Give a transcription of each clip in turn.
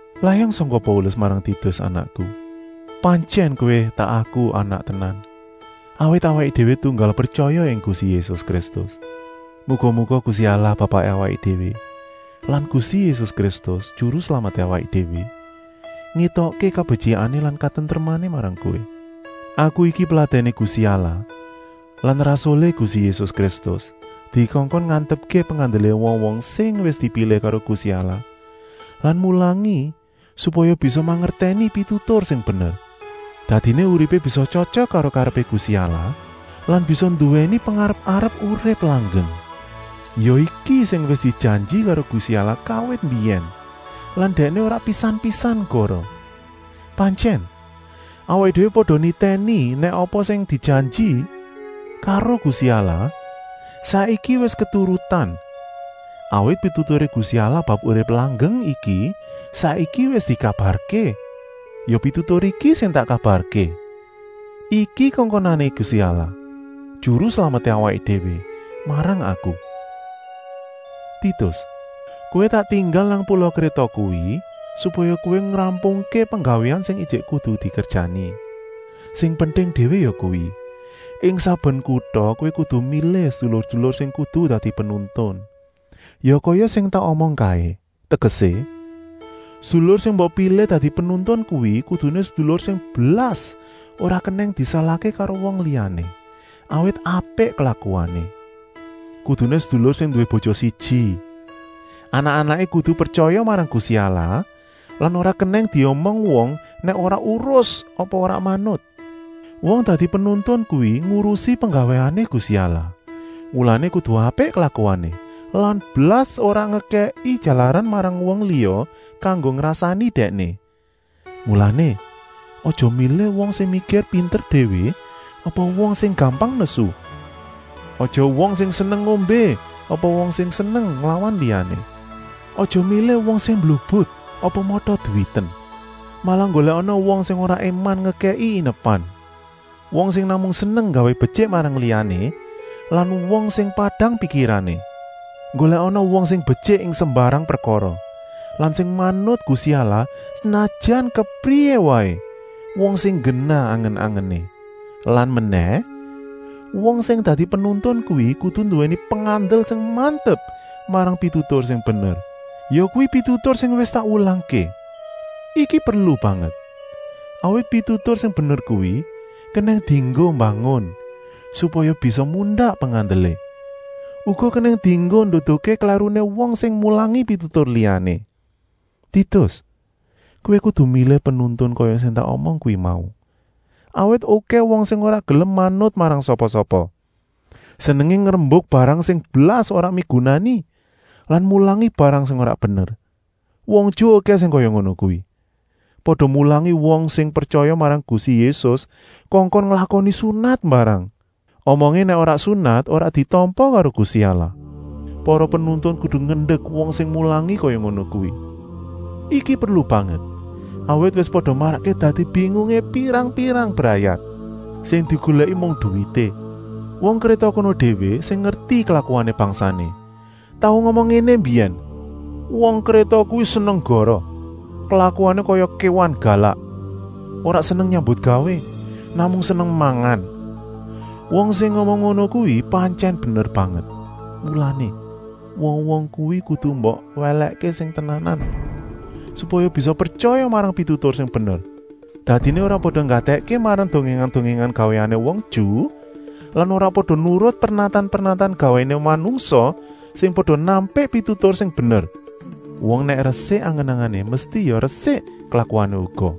Layang sangka Paulus marang Titus anakku. Pantyèn kowé tak aku anak tenan, awit awaké déwé tunggal pretyaya ing Gusti Yésus Kristus. Muga-muga Gusti Allah Bapaké awaké déwé lan Gusti Yésus Kristus, Juru Slameté awaké déwé, ngétokké kabetyikané lan katentremané marang kowé. Aku iki peladèné Gusti Allah lan rasulé Gusti Yésus Kristus dikongkon ngantepké pengandelé wong-wong sing wis dipilih karo Gusti Allah lan mulangi supaya bisa mangertèni pitutur sing bener. Dadiné uripé bisa tyotyok karo karepé Gusti Allah lan bisa nduwèni pengarep-arep urip langgeng. Ya iki sing wis dijanji karo Gusti Allah kawit mbiyèn lan Dèkné ora pisan-pisan goroh. Pantyèn, awaké déwé pada nitèni nèk apa sing dijanji karo Gusti Allah saiki wis keturutan, awit pituturé Gusti Allah bab urip langgeng iki saiki wis dikabarké. Ya pitutur iki sing tak kabarké. Iki kongkonané Gusti Allah, Juru Slameté awaké déwé, marang aku. Titus, kowé tak tinggal nang pula Kréta kuwi supaya kowé ngrampungké penggawéan sing ijik kudu dikerjani. Sing penting déwé yakuwi, ing saben kuta kowé kudu milih sedulur-sedulur sing kudu dadi penuntun, ya kaya sing wis tak omong kaé. Tegesé, sedulur sing mbok pilih dadi penuntun kuwi kuduné sedulur sing blas ora kenèng disalahké karo wong liyané, awit apik klakuané. Kuduné sedulur sing nduwé bojo siji. Anak-anaké kudu pretyaya marang Gusti Allah lan ora kenèng diomong wong nèk ora urus apa ora manut. Wong dadi penuntun kuwi ngurusi penggawéané Gusti Allah, mulané kudu apik klakuané lan blas ora ngekèki jalaran marang wong liya kanggo ngrasani dèkné. Mulané, aja milih wong sing mikir pinter déwé apa wong sing gampang nesu. Aja wong sing seneng ngombé apa wong sing seneng nglawan liyané. Aja milih wong sing mblubut apa mata-duwiten. Malah nggolèkana wong sing ora éman ngekèki inepan, wong sing namung seneng nggawé betyik marang liyané lan wong sing padang pikirané. Nggolèkana wong sing betyik ing sembarang prekara lan sing manut Gusti Allah senajan kepriyé waé, wong sing nggenah angen-angené. Lan menèh, wong sing dadi penuntun kuwi kudu nduwèni pengandel sing mantep marang pitutur sing bener, yakuwi pitutur sing wis tak wulangké. Iki perlu banget, awit pitutur sing bener kuwi kenèng dienggo mbangun, supaya bisa mundak pengandelé. Uga kenèng dienggo nduduhké klèruné wong sing mulangi pitutur liyané. Titus, kowé kudu milih penuntun kaya sing tak omong kuwi mau, awit okèh wong sing ora gelem manut marang sapa-sapa. Senengé ngrembuk barang sing blas ora migunani lan mulangi barang sing ora bener. Wong Ju okèh sing kaya ngono kuwi, pada mulangi wong sing pretyaya marang Gusti Yésus kongkon nglakoni sunat mbarang. Omongé nèk ora sunat ora ditampa karo Gusti Allah. Para penuntun kudu ngendek wong sing mulangi kaya ngono kuwi. Iki perlu banget, awit wis pada marakké dadi bingungé pirang-pirang brayat. Sing digolèki mung duwité. Wong Kréta kono déwé sing ngerti klakuané bangsané, tau ngomong ngéné mbiyèn: “Wong Kréta kuwi seneng goroh. Klakuané kaya kéwan galak. Ora seneng nyambutgawé, namung seneng mangan.” Wong sing ngomong ngono kuwi pantyèn bener banget. Mulané, wong-wong kuwi kudu mbok welèkké sing tenanan, supaya bisa pretyaya marang pitutur sing bener. Dadiné ora pada nggatèkké marang dongèngan-dongèngan gawéané wong Ju lan ora pada nurut pernatan-pernatan gawéané manungsa sing pada nampik pitutur sing bener. Wong nèk resik angen-angené mesti ya resik klakuané uga.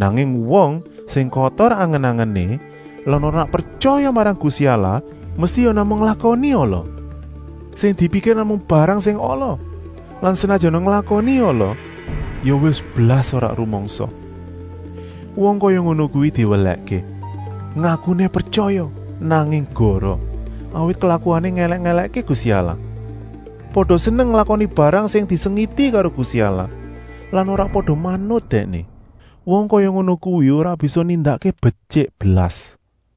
Nanging wong sing kotor angen-angené lan ora pretyaya marang Gusti Allah mesti ya namung nglakoni ala. Sing dipikir namung barang sing ala lan senajana nglakoni ala, ya wis blas ora rumangsa. Wong kaya ngono kuwi diwelèhké. Ngakuné pretyaya, nanging goroh, awit klakuané ngèlèk-èlèkké Gusti Allah. Pada seneng nglakoni barang sing disengiti karo Gusti Allah lan ora pada manut Dèkné. Wong kaya ngono kuwi ora bisa nindakké betyik blas.